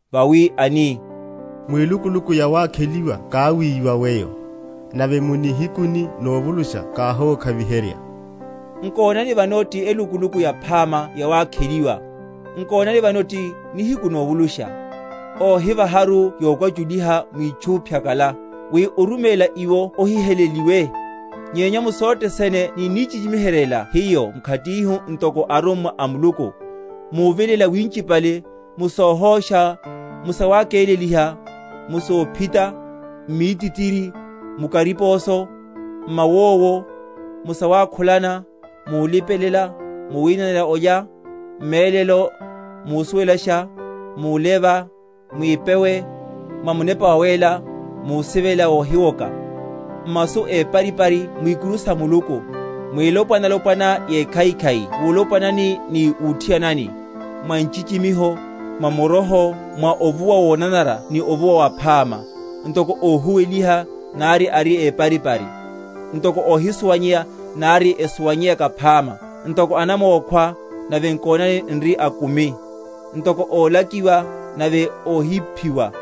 (vawi ani, Mwilukuluku yawakheliwa káwíwa weyo, Nave mu nihikuni novulusha káhókhaviherya; nkonani, vano ti elukuluku yaphama yawakheliwa, nkonani, vano ti nihiku novulusha); óhivaharu yokwachuliha mwitchu phyakala, wi oruméla iwo ohiheleliwe; nyenya mu sothe sene ninnichichimiheryela hiyo mkhatihu ntoko arummwa a Muluku, muvilela winchipale, mu sohósha, mu sawakeleliha, mu sophita, m’mítitiri, mu kariposo, m’mawowo, mu sawukhula, mulipelela, mu winanela olya; m’mélelo, musuwelasha, muleva, mwipewe, mwa Munepa Wawéla, musivela wohiwoka; m’masu éparipari, mwikuru sa Muluku; mwilopwana‐lopwana yekhaikhai wulopwanani ni wuthianani, mwa nchichimiho, mwa muroho, mwa ovuwa wonanara ni ovuwa waphama; ntoko óhuweliha, nari ari éparipari; ntoko óhisuwanyeya, nari esuwanyeyaka phama; ntoko anamókhwa, nave nkonani n’ri akumi; ntoko ólakiwa, nave óhiphiwa;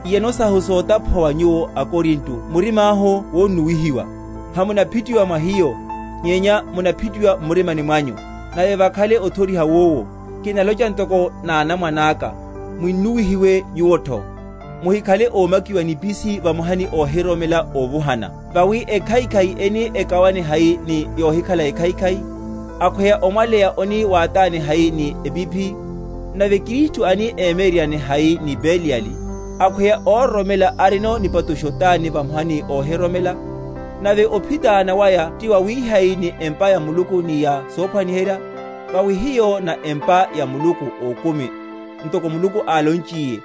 Iyano sahu sotaphuwa wa nyuwo aKorinto murimáhu wonnuwihiwa. Hamunaphitiwa mwa hiyo, nyenya munaphitiwa m’murimani mwanyu. Nave vakhale othoriha wowu (kinalocha ntoko nánamwane aka) munnuwihiwe nvuwotho. Muhikhale ómakiwa mu nipisini vamoha ni óhiroromela óvuhana; vawi ekhaikhai eni ekawane hai ni yohikhale ekhaikhai? Akhweya omwaleya oni wátáne hai ni epiphi? Nave Kristu ani emyeryeryane hai ni Beliyali? Akhweya óroromela arinono nipatusho tani vamoha ni óhiroromela? Nave ophitána waya tiwawihai ni empa ya Muluku ni ya sophwaniherya? Vawi hiyo na empa ya Muluku Ókumi; ntoko Muluku álonchiye,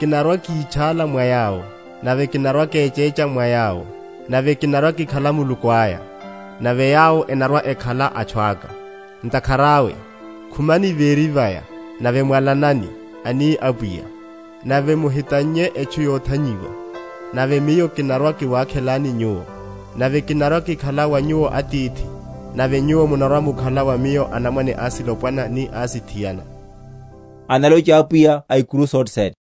Kinarwa‐kítchála mwa yawo, nave kinarwa‐kechécha mwa yawo; nave kinarwa‐kikhala Muluku aya, nave yawo enarwa‐ekhala atchu aka. Ntakhara awe, Khumani véri vaya, nave mwalanani, ani Apwiya, Nave muhitannye etchu yothanyiwa; Nave Miyo kinarwa‐kiwakhelani nyuwo, Nave kinarwa‐kikhala wa nyuwo Atithi, Nave nyuwo munarwa‐mukhala wa Miyo anamwane asilopwana ni asithiana, analocha Apwiya A’kuru sothene.